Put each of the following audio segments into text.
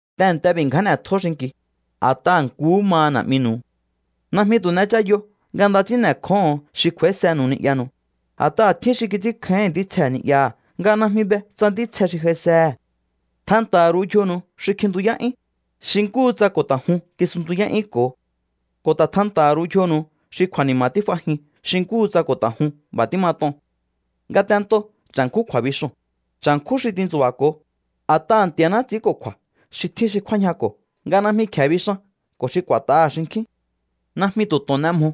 Tehe̱nte b'i̱ ngján n'e̱tjó xinki̱u, a̱t'aha̱ nkuhú maha Na̱'minu̱u. Najmi tu̱ n'echayo nga nda ts'ín n'e̱kjóho̱on xi kj'u̱a̱ísenu̱u ni'yanu̱u, a̱t'aha̱ tjín xi kits'ínkjáíhi̱n ntítsje ni'yaha̱ nga najmi be tsa ntítsje xi j'aisehe̱. Tjanta̱ha̱ ru̱u yjonu̱u xi kjintuyá'yún, xi nkúhu tsa ko̱ ta̱ jun kisuntuyá'yúnko̱o. Ko̱ ta̱ tjanta̱ha̱ ru̱u yjonu̱u xi kju̱a̱ni̱ma̱ tíf'ajin xi nkúhu tsa ko̱ ta̱ jun b'a̱ tímat'on. Ngatento cha̱nkjún kju̱a̱bixoo̱n, cha̱nkjún xi tintsu̱ba̱ko̱o, a̱t'aha̱ Nti̱a̱ná ts'i̱ínko̱kju̱a̱ xi tjín xi kjúájñako̱ nga najmi kje̱e bixan ko̱ xi k'u̱a̱t'aha̱ xinkjín. Najmi tu̱ to̱on n'e mjo.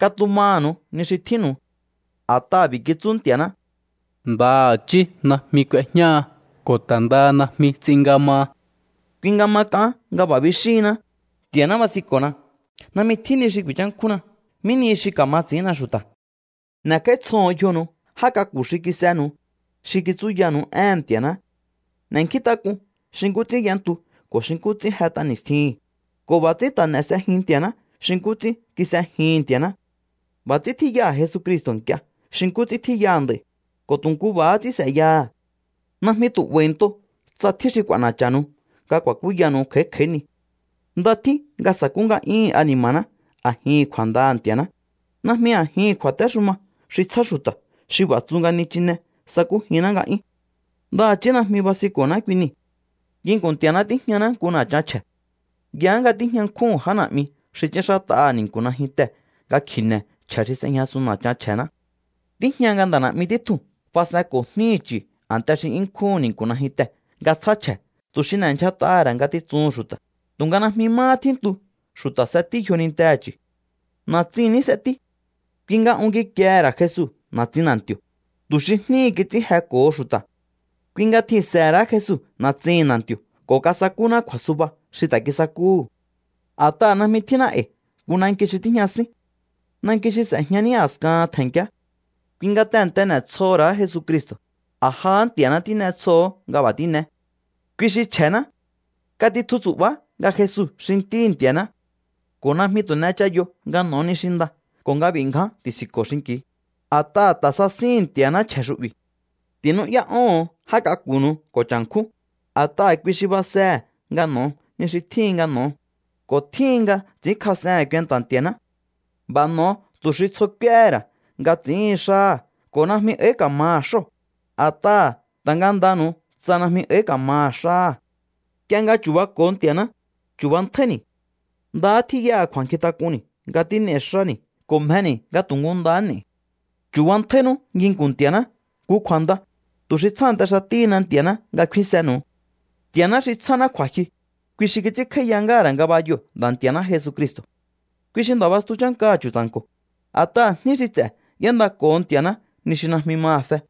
Katumaha̱nu̱u ni xi tjínnu̱u. A̱t'aha̱ b'i̱ kitsú Nti̱a̱ná: “Ndaha̱chí najmi k'uejñáha ko̱ ta̱ ndaha najmi ts'in nga maha.” Kui nga ma k'aán nga b'a̱ bixíhinná: Nti̱a̱ná basinko̱na, najmi tjín ni xi ku̱i̱nchánkjúnna. ¿Mí nihi xi ka̱ma ts'i̱ínna xu̱ta̱? N'e̱kj'áítsjoho̱on yjonu̱u já k'aku̱ xi kis'enu̱u, xi kitsúyanu̱u éhe̱n Nti̱a̱ná. N'e̱nkjíntak'un xi nkú ts'ín y'entu ko̱ xi nkú ts'ín jet'a ni̱stjihi̱n, ko̱ b'a̱ ts'ín ta̱ n'e̱ s'ejiun Nti̱a̱ná xi nkú ts'ín kis'ejihi̱n Nti̱a̱ná. B'a̱ ts'ín tjíyaha̱ Jesucristo̱ nk'ie xi nkú ts'ín tjíyaha̱ nd'a̱i̱, ko̱ tu̱ nkú b'a̱há ts'ín s'e̱yaha̱. Najmi tu̱ 'ba̱i̱nto tsa tjín xi k'u̱a̱na̱cha̱nu̱u nga ku̱a̱kúyanu̱u kj'a̱í kj'a̱í ni. Nda tjín nga sakú nga'yúhu̱n ani̱ma̱ná a̱jin kju̱a̱ndaha̱ Nti̱a̱ná, najmi a̱jihi̱n kju̱a̱téxuma xi tsjá xu̱ta̱ xi b'a̱ tsu nga nichinee̱ sakújinná nga'yún. Ndaha̱chí najmi basinko̱ná kui nii̱. Nginku̱n Nti̱a̱ná tíjñaná nku na̱chan chje̱. Yaá nga tíjña nkjúhu̱n já na̱'mi xi ts'ínxát'aha̱ ni̱nku̱ najyuntee̱ nga kji̱ne̱ chje̱ xi s'ejñasun na̱chan chje̱ná. Tíjña nga nda̱ na̱'mi títjuu̱n fas'enko̱ jníhi̱ chu̱ a̱nte xi 'yún nkjúhu̱n ni̱nku̱ najyuntee̱ nga tsjá chje̱ tu̱ xi n'endyjat'aha̱ ra̱ ngatitsuhu̱n xu̱ta̱, tu̱nga najmi máhá tjíntu xu̱ta̱ s'etí yjonintehe̱ chu̱. Na̱tsin ní s'etí. Kui nga un kikiehe̱ ra̱ Jesu na̱tsin na̱nti̱o̱, tu̱ xi jníhi̱ kits'ín jeko̱ho xu̱ta̱. Kui nga tjihi̱nse̱he̱ ra̱á Jesu na̱tsihi̱n na̱nti̱o̱ ko̱ kasakúná kju̱a̱suba xi ta̱ kisakúhu̱. A̱t'aha̱ najmi tjínná e̱i̱ nku nanki xi tíjña sín. Nanki xi s'e̱jña ní a̱skahan tje̱nkiá. Kui nga tehe̱nte n'e̱tsjoho̱ ra̱á Jesucristo̱, a̱ jahá Nti̱a̱ná tín'etsjoho̱o nga b'a̱ tín'eé. Kui xi chje̱ná. Katitju tsu̱'ba̱á nga Jesu xi Ntíhi̱ Nti̱a̱ná. Ko̱ najmi tu̱ n'echayo nga n'o̱o ni xi nda ko̱ nga b'i̱ ngján ti̱si̱nko̱o xinki̱u, a̱t'aha̱ ta̱ sasíhi̱n Nti̱a̱ná chje̱ xu'bi̱. Ti̱nú'yá'óho̱on já k'aku̱nu̱u ko̱ cha̱nkjún, a̱t'aha̱ kui xi basehe̱ nga n'o̱o ni xi tjíhin nga n'o̱o, ko̱ tjíhin nga ts'i̱ínkjas'ehe̱n kuenta̱ Nti̱a̱ná. B'a̱ n'o̱o tu̱ xi tsjo k'úéhe̱ ra̱ nga ts'i̱íhin xáha̱ ko̱ najmi áí ka̱maha̱ xóo̱, a̱t'aha̱ ta̱ ngandanu̱u tsa najmi áí ka̱maha̱ xáha̱. Nk'ie nga chu̱bako̱o Nti̱a̱ná, chu̱bantjáíni̱. Ndahá tjíya kju̱a̱nkjintak'unni̱ nga tín'ei̱ xáni̱ ko̱ mjeni̱ nga tu̱ nkú ndahá n'e̱i̱. Chu̱bantjáínú nginku̱n Nti̱a̱ná nku kju̱a̱nda, tu̱ xi tsjánte xatíhina Nti̱a̱ná nga kfínsenu̱u. Nti̱a̱ná xi tsjáná kju̱a̱jyu, kui xi kits'ínkj'áíya ngáha̱ ra̱ ngabayoo̱ Nda̱ Nti̱a̱ná Jesucristo̱. Kui xi Nda̱ bastu chánkaha̱ chu̱tsa̱nko̱, a̱t'aha̱ jní xi ts'e̱ y'éndako̱ho Nti̱a̱ná ni xi najmi maha̱ fe.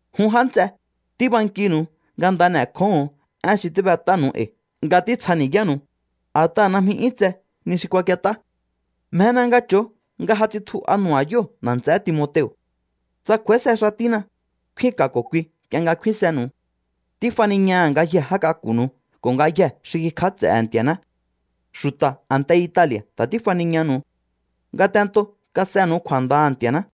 Jun já nts'e, tíbankinu̱u nga nda n'e̱kjóho̱on én xi tíb'et'ánu̱u e̱i̱ nga títsjani̱yánu̱u, a̱t'aha̱ najmi 'yún tse ni xi kuakiet'á. Mjena nga cho̱o nga ja tsitju'a nu̱ba̱yóo̱ nda̱ nts'eé Timoteo̱. Tsa kj'u̱a̱íse xatína, kfínka̱ ko̱ kui nk'ie nga kfínsenu̱u. Tífaniñaha̱ ngayjee̱ já k'aku̱nu̱u ko̱ ngayjee̱ xi kikj'áts'e̱he̱ Nti̱a̱ná. Xu̱ta̱ a̱nte Itali̱a̱ ta̱ tífaniñanu̱u. Ngatentoo̱ kas'enu̱u kju̱a̱ndaha̱ Nti̱a̱ná.